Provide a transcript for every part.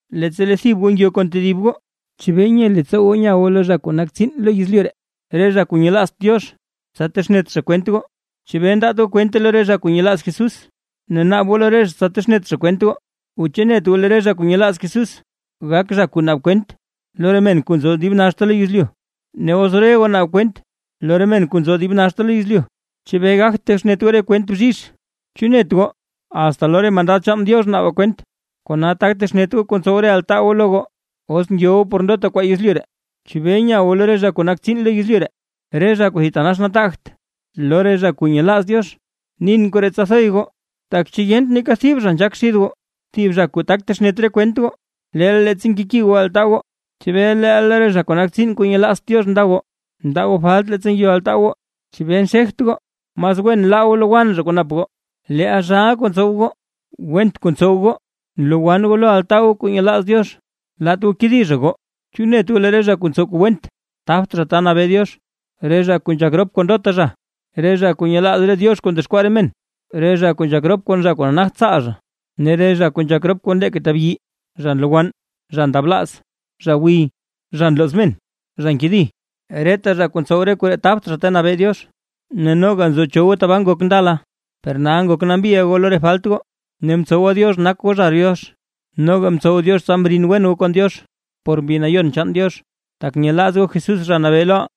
Leettsa lee thib goo ngyo kon tedib goo, ¿chebee nye leettsoo goo nya goo lo re zha kuu nak tsiin lo yezlyu ree, re zha kuu nyelaazt Diox, tsa texnet zha kwent goo? ¿Chebee ndaat goo kwente lo re zha kuu nyelaaz Jesús, ne naab goo lo re zha texnet zha kwent goo? ¿O chu net goo lee re zha kuu nyelaaz Jesús, gak zha kuu naab kwent lo re men kuu nzo lo dib naxta lo yezlyu? Ne os re goo naab kwent lo re men kuu nzo lo dib naxta yezlyu, ¿chebee gagt texnet goo re kwent bzhizh? ¿Chu net goo, asta lo re mandad chaan Diox naabaa kwent? ¡Kona tak texnet goo kuu ntsow re altaa lo goo! Os ngyo goo por ndota kwaa yezlyu ree, ¿chebee nya goo lo re zha kuu nak tsiin lo yezlyu ree, re zha kuu thitanax nataagt lo re zha kuu nyelaaz Diox? ¡Nin koree tsa thoy goo! Tak ¿chu yent neeka thib zha nzhaak xid goo, thib zha kuu tak texnet re kwent goo? ¡Leel, leettsa nkeki goo altaa goo, chebee leel lo re zha nak tsiin kuu nyelaazt Diox nda goo! Ndaa goo falt leettsa ngyo altaa goo. ¿Chebee nxegt goo? ¡Mas wen laa goo lowann zha kuu nap goo! Leel zhaaʼa kuu ntsow goo, went kuu ntsow goo, nlowann goo lo altaa goo kuu nyelaaz Diox. Laat goo kedi zha goo, ¿chu net goo lee re zha kuu ntsow kuu went, tabt zha ta nabee Diox? Re zha kuu nzhak rop kon ndota zha, re zha kuu nyelaaz re diox kuu ndexkwaa re men, re zha kuu nzhak rop kon zha kuu nagt tsaal zha, ne re zha kuu nzhak rop kon leeka tabyi, zha nlowann, zha ndablaaz, zha gwiy, zha nlooz men, zha nkedi, reta zha kuu ntsow re koree tabt zha ta nabee Diox. Ne noga nzo cho goo tabaa ngok ndala, per nal ngok nambiʼa goo lo re falt goo, ne mtsowa Diox nak goo zha Diox, noga mtsow Diox tsa mrin wen goo kon Diox por Mbi Nayon chaan Diox, tak nyelaaz goo Jesús Zha Nabee loʼaa.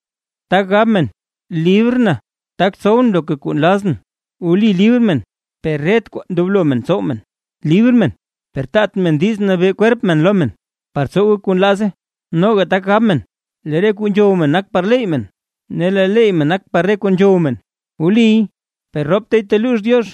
Tak gab men: “Librʼn, tak tsowʼn loka kuu nlazʼn”. Wli libr men, per ret kwaa ndoblo men tsow men. Libr men, per taat men diiz nabee kwerp men lo men, par tsowe kuu nlaaze. Noga tak gab men: “Lee re kuu nzhow men nak par leettsoo men, ne lee leettsoo men nak par re kuu nzhow men”. Wliy, per roptay teluux Diox.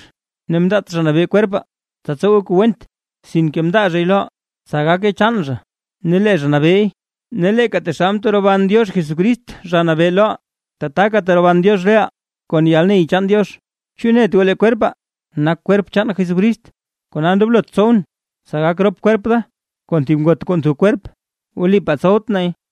Ne mndaat Zha Nabee kwerpaa tsa tsowe kuu went, sinke mndaa zhay loʼaa, tsa gake chaan zha ne lee zha nabeey. Ne leeka taxal mteroban Diox Jesucrist Zha Nabee loʼaa, tataka teroban Diox reʼaa kon yalney chaan Diox. ¿Chu net goo lee kwerpaa, nak kwerp chaan Jesucrist? Kona ndoblot tsowʼn, tsa gak rop kwerp da kon thib ngot kuu ntho kwerp. ¡Wlipaa tsowt nay!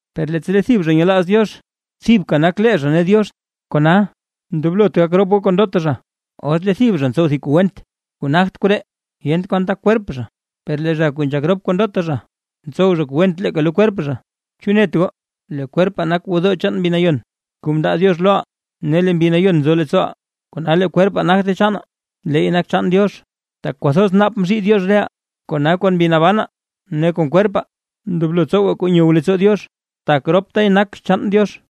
Per leettsa lee thib zha nyelaaz Diox, thibka nak lee zha ne Diox. Kona, ndoblot gak rop goo kon ndota zha. Os lee thib zha ntsow thib kuu went kuu nagt koree, yent kwan tak kwerp zha; per lee zha kuu nzhak rop kon ndota zha, ntsow zha kuu went leeka lo kwerp zha. ¿Chu net goo, lee kwerpaa nak gwodoo chaan Mbi Nayon kuu mndaa Diox loʼaa, ne lee Mbi Nayon nzo leettsooʼaa? Kona lee kwerpaa, nagte chaanaa, leey nak chaan Diox, tak kwathoz naap mzhii Diox reʼaa. Kona kon mbi nabanaa ne kon kwerpaa, ndoblo tsowaa kuu nyow leettsoo Diox, tak roptay nak chaan Diox.